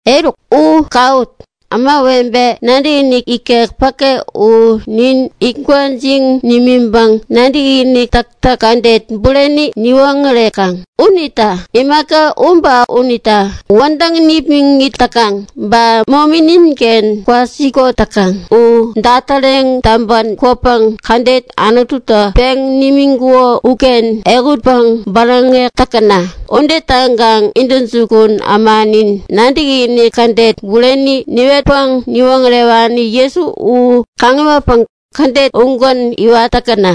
Eruk, u kawut! Ämawebe nadäkinik ikek päke u nin it gwäjiŋ nimiŋpäŋ nadäkinik täktäk kädet bureni niwoŋärekaŋ. Unita imaka u ba unitä wädäŋ nipmäŋit täkaŋ ba momi ninken kwasikot täkaŋ u datäreŋ täŋpä kwäpäŋ kädet Anututä peŋ nimiŋkuko uken ehutpäŋ bäräŋek täkäna. Ude täŋkaŋ intäjukun ämanin, nadäkinik kädet bureni niwetpäŋ niwoŋärewani Jesu u kaŋiwatpäŋ kädet ugän iwat täkäna.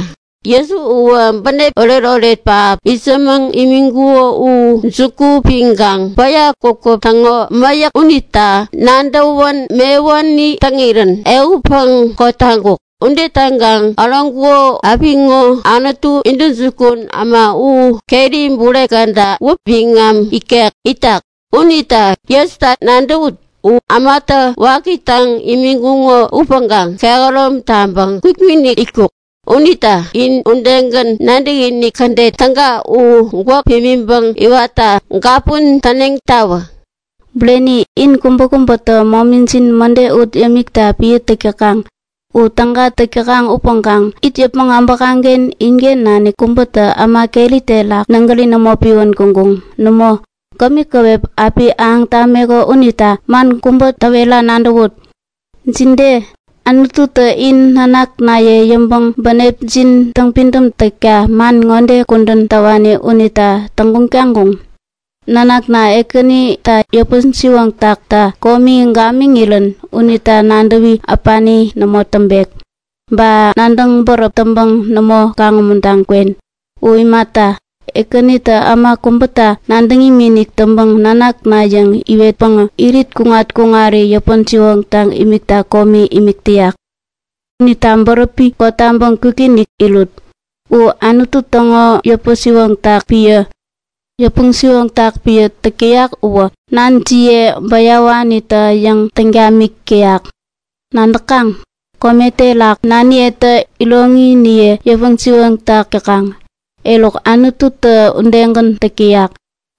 Jesu uwä bänep oretoret pähap itsämäŋ imiŋkuko u juku piŋkaŋ päya kwakäp täŋo mäyäk unita nadäwän mewuni täŋirän ehutpäŋ kotaŋkuk. Ude täŋkaŋ äroŋkuko apiŋo Anutu intäjukun äma u keri bure käda wäpi biŋam ikek itak. Unita Jesuta nadäwut. U ämatä waki täŋ imiŋkuŋo upäŋkaŋ kehärom taŋpäŋ kwikinik itkuk. Unita in udegän nadäkinik kädet täga u gwäk pimiŋpäŋ iwatta gapun täneŋtawä. Bureni, in kubäkubätä momijin mäde ut yämikta piä täk täkaŋ. U täga täk täkaŋ upäŋkaŋ it yäpmäŋ abäkaŋken inken nanik kubätä äma keri terak nägäri nämo piwän kuŋkuŋ. Nämo, kämi käwep api ahäŋ tameko unita man kubä täwera nadäwut. Jide, Anututä in nanaknaye yäŋpäŋ bänepjin täŋpidäm takta man ŋode kudän täwani unita täŋguŋ taŋkuŋ? Nanakna, Ekänitä yäpän-siwoŋ takta komi gamiŋirän unita nadäwi äpani nämo täŋpek, ba nadäŋ bäräp täŋpäŋ nämo kaŋ-umuntaŋ kwen. U imata, Ekänitä äma kubäta nadäŋ imikinik täŋpäŋ nanakna yäŋ iwetpäŋä irit kuŋat-kuŋari yäpän-siwoŋtaŋ imikta komi imik täyak. Unita bäräpi kotaŋpäŋ kwikinik irut. U Anutu täŋo yäpä-siwoŋtak piä. Yäpä-siwoŋtak piä täk täyak uwä nanjiye bäyawanitä-yäŋ täŋ tamik täyak. Nadäkaŋ? Kome terak naniyetä iroŋiniye yäpä-siwoŋtak täkaŋ. Eruk, Anututä udegän täk täyak.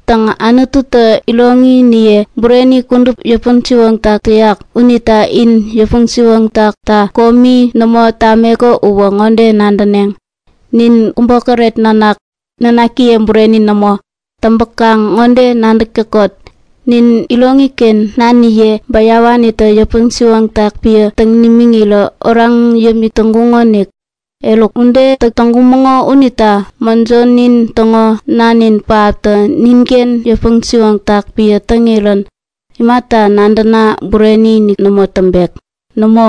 Täŋ, Anututä iroŋiniye bureni kudup yäpän-siwoŋtak täyak unita in yäpä-siwoŋ takta komi nämo tameko uwä ŋode nadäneŋ; Nin kubokäret nanak, nanakiye bureni nämo. Täŋpäkaŋ ŋode nadäk täkot; Nin iroŋiken naniye bäyawanitä yäpä-siwoŋtak piä täŋ nimiŋirä oraŋ yämik täŋkumäŋonik. Eruk, ude täk täŋkumäŋo unita mäjonin täŋo Nanin pähaptä ninken yäpä-siwoŋtak piä täŋirän, imata nadäna bureni-inik nämo täŋpek? Nämo,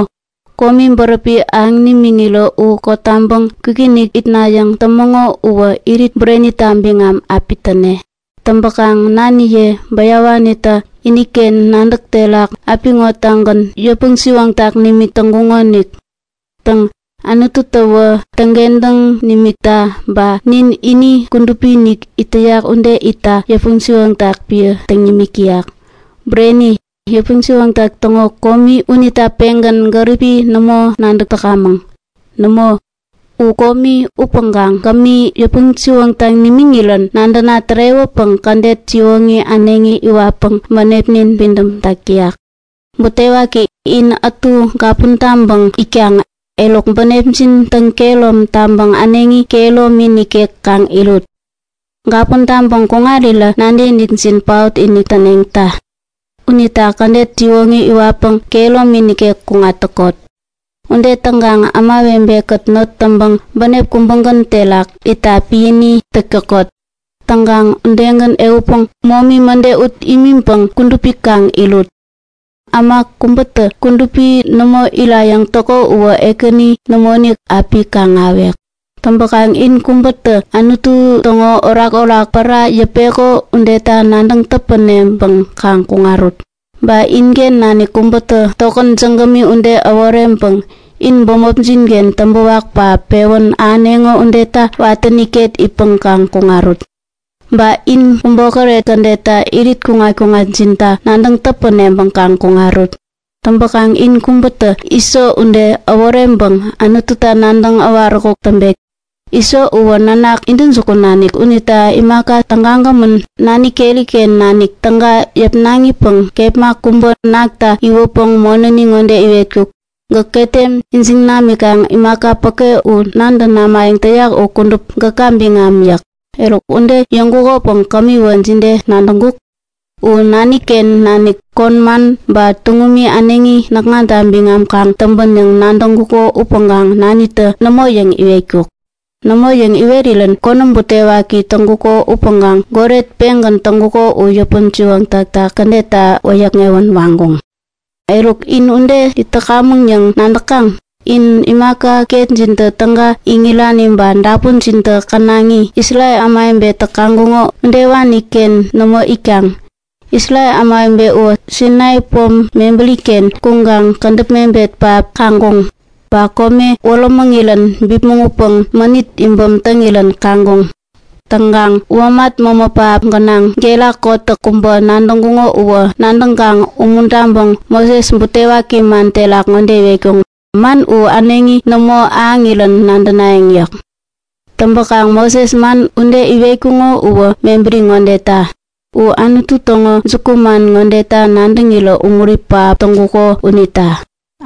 komi bäräpi ahäŋ nimiŋirä u kotaŋpäŋ kwikinik itnayäŋ tämäŋo uwä irit burenita biŋam api täne. Täŋpäkaŋ naniye bäyawanitä iniken nadäk terak apiŋotagän yäpä-siwoŋtaŋ nimik täŋkuŋonik. Täŋ, Anututäwä täŋkentäŋ nimikta ba nin ini kudupi-inik it täyak udegän itta yäpä-siwoŋtak piä täŋ nimik täyak. Bureni, yäpä-siwoŋtak täŋo komi unita pengän gäripi nämo nadäk täkamäŋ. Nämo, u komi! Upäŋkaŋ kämi, yäpän-siwoŋtaŋ nimiŋirän nadäna tärewäpäŋ kädet siwoŋi äneŋi iwatpäŋ bänepnin pidämtak täyak. Butewaki! In ätu gapun taŋpäŋ itkaŋ. Eruk bänepjin täŋkehärom taŋpäŋ äneŋi kehäromi nikek kaŋ irut! Gapun taŋpäŋ kuŋarirä nadäkinikjin paot-inik täneŋta! Unita kädet siwoŋi iwatpäŋ kehäromi nikek kuŋat täkot. Ude täŋkaŋ ämawebe-kät not täŋpäŋ bänep kubägän terak itta piäni täk täkot. Täŋkaŋ udegän, ehutpäŋ momi täktäk kädet mäde ut imiŋpäŋ kudupi kaŋ irut. Nadäkaŋ? Äma kubätä kudupi nämo irayäŋ täko uwä Ekäni nämoinik api kaŋ-ahäwek. Täŋpäkaŋ in kubätä Anutu täŋo orakorak pära yäpeko udeta nadäŋ täpäneŋpäŋ kaŋ kuŋarut. Ba inken nanik kubätä tokän jägämi ude äworeŋpäŋ in bämopjin-ken täŋpäwak pähap pewän ahäneŋo udeta watäni ket itpäŋ kaŋ kuŋarut. Ba in kubokäret täneŋo udeta irit kuŋat-kuŋatjinta nadäŋ täpäneŋpäŋ kaŋ kuŋarut. Täŋpäkaŋ in kubätä Iso ude äworeŋpäŋ Anututa nadäŋ äwaräkuk täŋpekta! Iso uwä nanak intäjukun nanik unita imaka tägagämän nani keri-ken nanik täga yäpnaŋipäŋ kepma kubä nakta iwäpäŋ monäni ŋode iwetkuk; Gäk ketem ijiŋ namikaŋ imaka päke nantä namayäŋ täyak u kudup gäka biŋam yäk. Eruk ude yäŋkukopäŋ kämiwä jide nadäŋkuk? U nani-ken nanik kon man ba tuŋumi äneŋi näkŋata biŋam kaŋ täŋpän yäŋ nadäŋkuko upäŋkaŋ nanitä Nämo yäŋ iwetkuk. Nämo yäŋ iwerirän konäm butewaki täŋkuko upäŋkaŋ goret pengän täŋkuko u yäpä-siwoŋtakta kädetta wäyäkŋewän waŋkuŋ. Eruk, in uken it täkamäŋ yäŋ nadäk täkaŋ? In imaka ketjintä täga iŋirani ba dapunjintä känaŋi, Isrel ämawebetä kaŋkuŋo udewani-ken nämo itkaŋ. Isrel ämawebe uwä Sainai pom mebäri-ken kuŋkaŋ kädäp mebet pähappäŋ kaŋkuŋ. Ba kome wärämäŋirän bipmäŋ utpäŋ mänit pähap piäŋirän kaŋkuŋ. Täŋkaŋ womat mämä pähap gänaŋ gera kotäk kubä nadäŋkuŋo uwä nadäŋkaŋ umuntaŋpäŋ Moses butewaki man terak ŋode iwetkuŋ; Man u äneŋi nämo ahäŋirän nadänayäŋ yäk. Täŋpäkaŋ Moses man ude iwetkuŋo uwä mebäri ŋodeta; U Anutu täŋo jukuman ŋodeta nadäŋirä umuri pähap täŋkuko unita;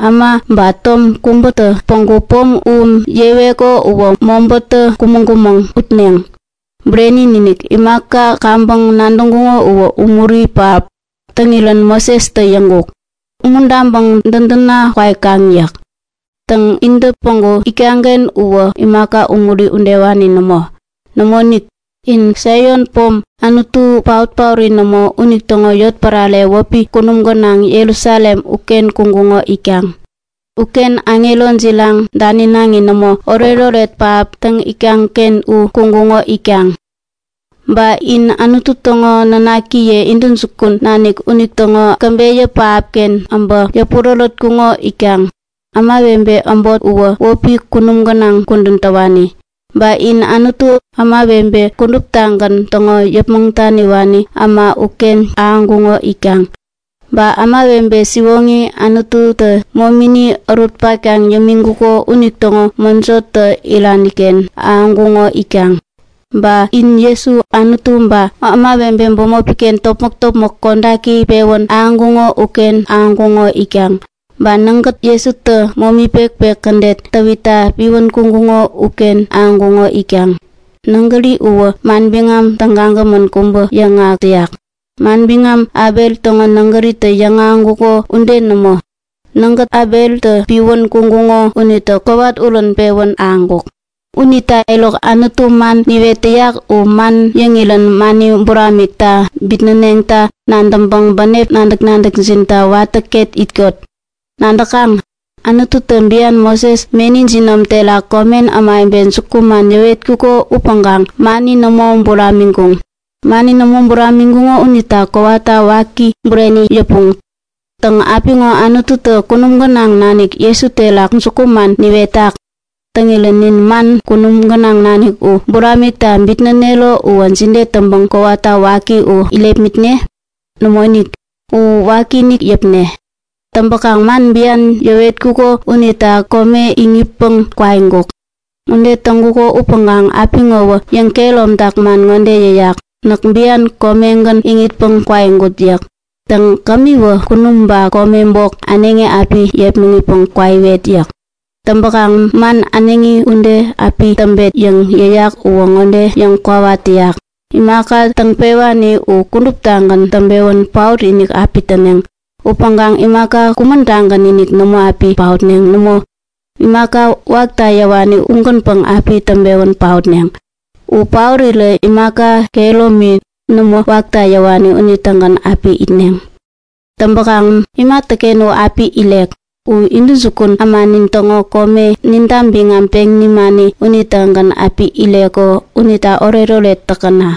Äma ba tom kubätä päŋku pom u yeweko uwä mobätä kumäŋ-kumäŋ utneŋ. Bureni-inik, imaka kaŋpäŋ nadäŋkuŋo uwä umuri pähap täŋirän Mosestä yäŋkuk; Umuntaŋpäŋ dädätna kwaikaŋ! yäk. Täŋ, intä päŋku itkaŋ-ken uwä imaka umuri udewani nämo. Nämoinik, inä Saion pom, Anutu paot-paori nämo unitäŋo yotpärare wäpi Kunum Gänaŋ Jerusalem uken kuŋkuŋo itkaŋ. Uken aŋero jiraŋ, daninaŋi nämo oretoret pähap täŋ itkaŋ-ken u kuŋkuŋo itkaŋ. Ba in Anutu täŋo nanakiye intäjukun nanik unitäŋo käbeyä pähapken äbä yäpurärätkuŋo itkaŋ. Ämawebe äbot uwä wäpi kunum gänaŋ kudän täwani. Ba in Anutu, ämawebe kuduptagän yäpmäŋ daniwani äma, uken ahäŋkuŋo itkaŋ. Ba ämawebe siwoŋi, Anututä momini ärut-paktaŋ yämiŋkuko unitäŋo mäjotä irani-ken ahäŋkuŋo itkaŋ. Ba in Jesu, Anutu ba ämawebeniye bämopi-ken topmäk-topmäk kodaki pewän ahäŋkuŋo uken ahäŋkuŋo itkaŋ. Ba nägät, Jesutä momi pekpek kädet täwitta piwän kuŋkuŋo uken ahäŋkuŋo itkaŋ. Nägäri uwä manbiŋam säkgämän kubä yäŋahäk täyak, manbiŋam Abel täŋo nägättä yäŋahäŋkuko ude nämo. Nägät Abeltä piwän kuŋkuŋo unitä kowat-urän pewän ahäŋkuk. Unita eruk, Anutu man niwet täyak u man yäŋirän mani buramikta bitnäneŋta nadäŋpäŋ bänep nadäk-nadäkjinta watä ket itkot. Nadäkaŋ? Anututä bian Moses meni jinom terak komen ämawebe jukuman yäwetkuko upäŋkaŋ mani nämo buramiŋkuŋ. Mani nämo buramiŋkuŋo unita kowata waki bureni yäpuŋ. Täŋ, apiŋo Anututä kunum gänaŋ nanik Jesu terak jukuman niwetak. Täŋirän nin man kunum gänaŋ nanik u buramikta bitnänero uwä jide täŋpäŋ kowata waki u irepmitne? Nämoinik, u wakiinik yäpne. Täŋpäkaŋ man bian yäwetkuko unitä kome iŋitpäŋ kwaiŋkuk. Ude täŋkuko upäŋkaŋ apiŋowä yäŋkehäromtak man ŋode yäyak; Näk bian komegän iŋitpäŋ kwaiŋkut yäk. Täŋ, kämiwä kunum ba kome bok äneŋi api yepmäŋitpäŋ kwaiwet yäk. Täŋpäkaŋ man “äneŋi ude api täŋpet” yäŋ yäyak uwä ŋode yäŋkwawa täyak; Imaka täŋ-pewani u kuduptagän täŋpewän paot-inik api täneŋ. Upäŋkaŋ imaka kumän-tagän-inik nämo api paotneŋ. Nämo, imaka wakta yäwani ugänpäŋ api täŋpewän paotneŋ. U paorirä imaka kehäromi, nämo wakta yäwani unitägän api itneŋ. Täŋpäkaŋ imatäken u api irek? U intäjukun ämanin täŋo kome ninta biŋam peŋ nimani unitägän api ireko unita oretoret täkäna!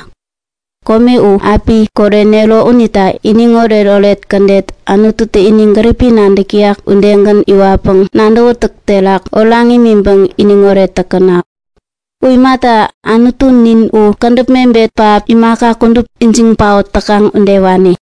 Kome u api korenero unita iniŋoret-oret kädet Anututä ini gäripi nadäk täyak udegän iwatpäŋ nadäwätäk terak oraŋ imiŋpäŋ iniŋoret täkäna. U imata, Anutunin u kädäp mebet pähap, imaka kudup ijiŋ paot täkaŋ udewani.